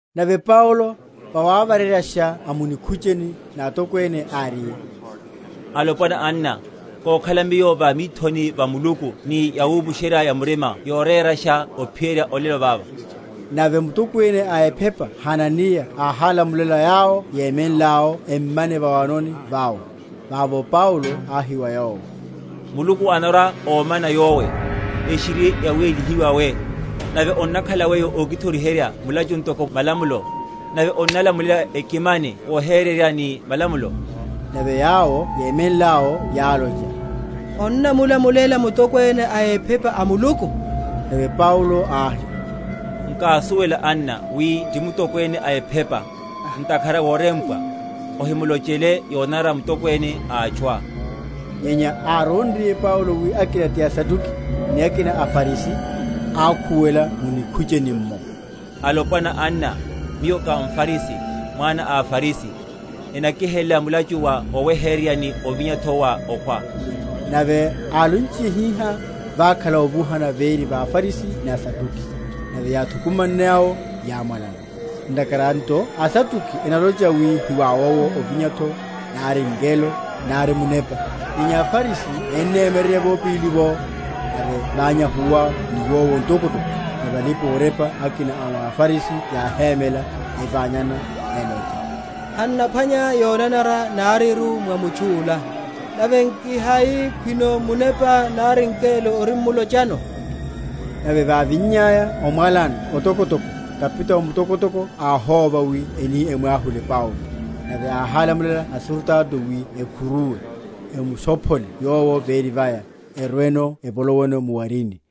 Nave Paulo, vawavareryasha a mu nikhucheni na atokwene, áriye, Alopwana, anna, kokhala miyo va mithoni va Muluku ni yawupusherya‐ya‐murima yorerasha ophiyerya olelo vava. Nave mutokwene a ephepa Hananiya áhálamulela yawo yemenle’wo emmane va’wanoni vawe. Vavo Paulo áhi wa yowo, Muluku anarwa‐omana yowe, eshiri yawélihiwa we; nave onnakhala weyo okithoriherya mulachu ntoko mwa malamulo, nave onnalamulela ekimane vohereryana ni malamulo? Nave yawo yémenle’wo yálocha, Onnamulumela mutokwene a ephepa a Muluku? Nave Paulo áhi, Nkásuwela, anna, wi ti mutokwene a ephepa; ntakhara worempwa, Ohimulochele yonanara mutokwene a atchuá. Nyenya árónriye Paulo wi akina ti aSaduki, ni akina aFarisi, ákhuwela mu nikhucheni’mmo, Alopwana, anna, miyo ká mFarisi, mwana a aFarisi: enakihelela mulachu wa oweheryerya, ni ovinya’tho wa okhwa. Nave álonchiye hihá, vakhala ovuhana véri va aFarisi ni aSaduki; nave yáthukumanne awo yámwalana. Ntakhara nto aSaduki enalocha wi hiwawowo ovinya’tho, nari ngelo, nari munepa; nyenya aFarisi ennemyererya vopili’vo. Nave ványahuwa niwowo ntokotoko; nave alipa‐orepa akina a wa aFarisi yáhémela, evanyana, elocha, Han’naphwanya yonanara nariru mwa mutchu’la; nave nki hai khwino munepa nari ngelo orimulochano? Nave vávinnyaya omwalana otokotoko, kapitao mutokotoko áhóva wi eni emwahule Paulo, nave áhálamulela asurutato wi ekhuruwe, emushophole yowo véri vaya, erweno evoloweno mu’warini.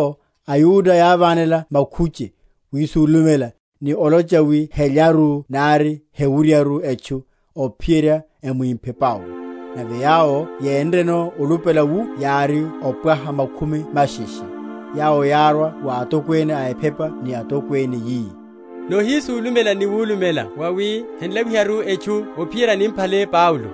Nave vashile’vo, aYuda yávanela makhuche, yisulumela, ni olocha wi helyaru nari hewuryaru etchu, ophiyerya emwimphe Paulo; nave yawo yénreno olupela wu yári opwaha makhumi masheshe. Yawo yárwa wa atokwene a ephepa ni atokwene, yi, Nohisulumela ni wulumela wawi hen’lawiharu etchu ophiyerya nimphale Paulo.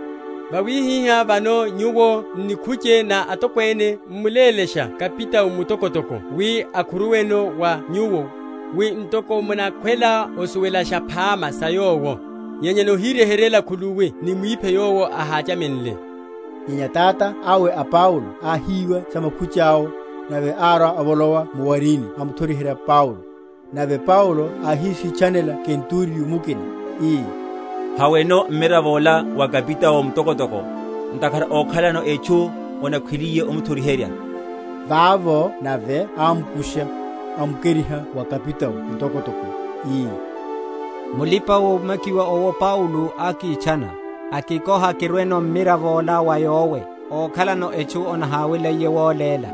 Vawihihá vano nyuwo n’nikhuche na atokwene m’mulélashe kapitao mutokotoko wi akhuruweno wa nyuwo, wi ntoko munakhwela osuwelasha phama sa yowo; nyenya nohiryeheryela khuluwi nimwiphe yowo ahachamenle. Nyenya tata awe a Paulo áhíwa sa makhuche awo, nave árwa avolowa mu’warini amuthoriherya Paulo. Nave Paulo áhisitchanela kenturiyo mukina, ii, Haweno mmiravo’la wa kapitao mutokotoko: ntakhara ókhalano etchu onahaweliye omuthoriherya. Vavo nave ámukusha, amukeriha wa kapitao mutokotoko, ii, Mulipa‐omakiwa owo Paulo ákitchana, akikoha kirweno mmiravo’la wa yowe, ókhalano etchu onahaweliye woléla.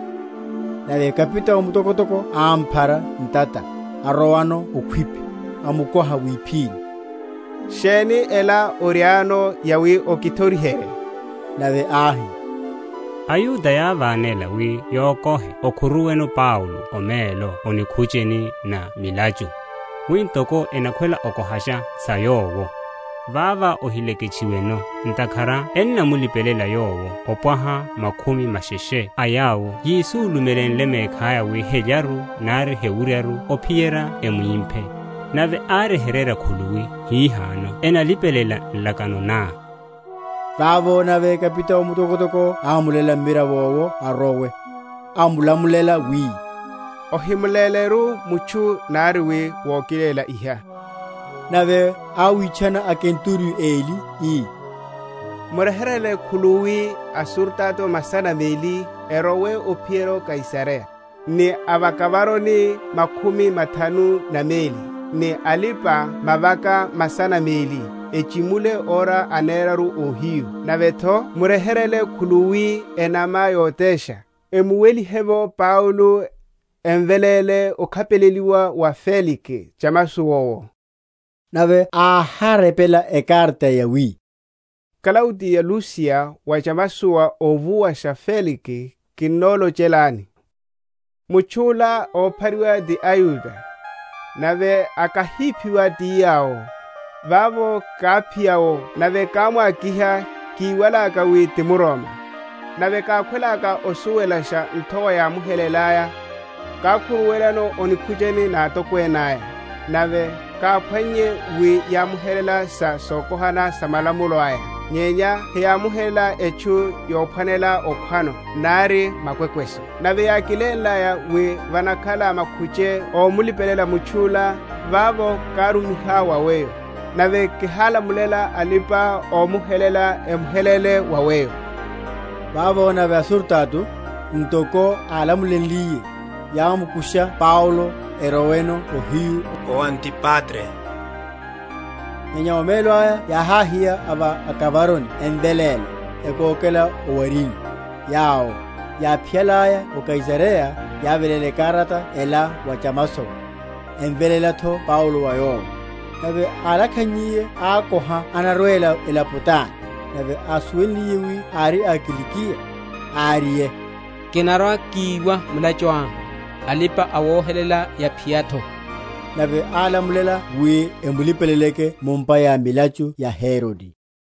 Nave kapitao mutokotoko ámphara ntata, arowano okhwipi, amukoha wiphini, Sheni ela oriáno yawi okithoriherye? Nave áhi, AYuda yávanela wi yokohe okhuruweno Paulo omelo o nikhucheni na milachu, wi ntoko enakhwela okohasha sa yowo, Vavá ohileketchiweno; ntakhara ennamulipelela yowo opwaha makhumi masheshe a yawo yisulumenle mekhaya wi helyaru nari hewuryaru ophiyerya emwimphe; nave áryeheryela khuluwi hihano enalipelela nlakano ná. Vavo nave kapitao mutokotoko ámuléla mmiravo’wo arowe, amulamuléla wi, Ohimuléleru mutchu nari wi wokilela iha. Nave áwitchana akenturiyo eli, ii, Muryeheryele khuluwi asurutato masana meli, erowe ophiyerya Kaisareya, ni a va akavaroni makhumi mathanu na meli, ni alipa‐mavaka masana meli, echimule ora aneraru óhiyu; nave’tho muryeheryele khuluwi enama yotesha, emuwelihe’vo Paulo, emveléle ókhapeleliwa wa Felike chamasowa owo. Nave áharepela ekarata yawi: Klaudiya Lusiya wa chamasowa óvuwasha Felike, kinnolochelani. Mutchu’la óphariwa ti aYuda, nave akahíphiwa ti yawo; vavo káphiya’wo, nave kámwa?-?kiha, kíwalaka wi ti mRoma. Nave kákhwelaka osuwelasha nthowa yámuhelélaya, kákhuruwelano o nikhucheni na atokwene aya. Nave káphwannye wi yámuhelela sa sokohana sa malamulo aya; nyenya heyámuhelenle etchu yophwanela okhwano nari makwekweso. Nave yákilenlaya wi vanakhala makhuche ómulipelela mutchu’la, vavo kámurumiha wa weyo; nave kihálamulela alipa‐omuhelela emuhelele wa weyo. Vavo nave asurutato, ntoko álamulenliye, yámukusha Paulo, erowano ohiyu o Antipatri. Nyenya omelo aya yáháhiya a va akavaroni emveléle, ekókela o’warini; yawo, yáphiyalaya o Kaisareya, yáveléla ekarata ela wa chamasowa, emveléla’tho Paulo wa yowo. Nave álakhannyiye ákoha anarwela elapo tani; nave ásuwenliye wi ári a Kilikiya, áriye, Kinarwa‐kiwa mulachuá, alipa‐awohelela yaphiya’tho. Nave álamulela wi emulipeleleke mu’mpa ya milachu ya Herode.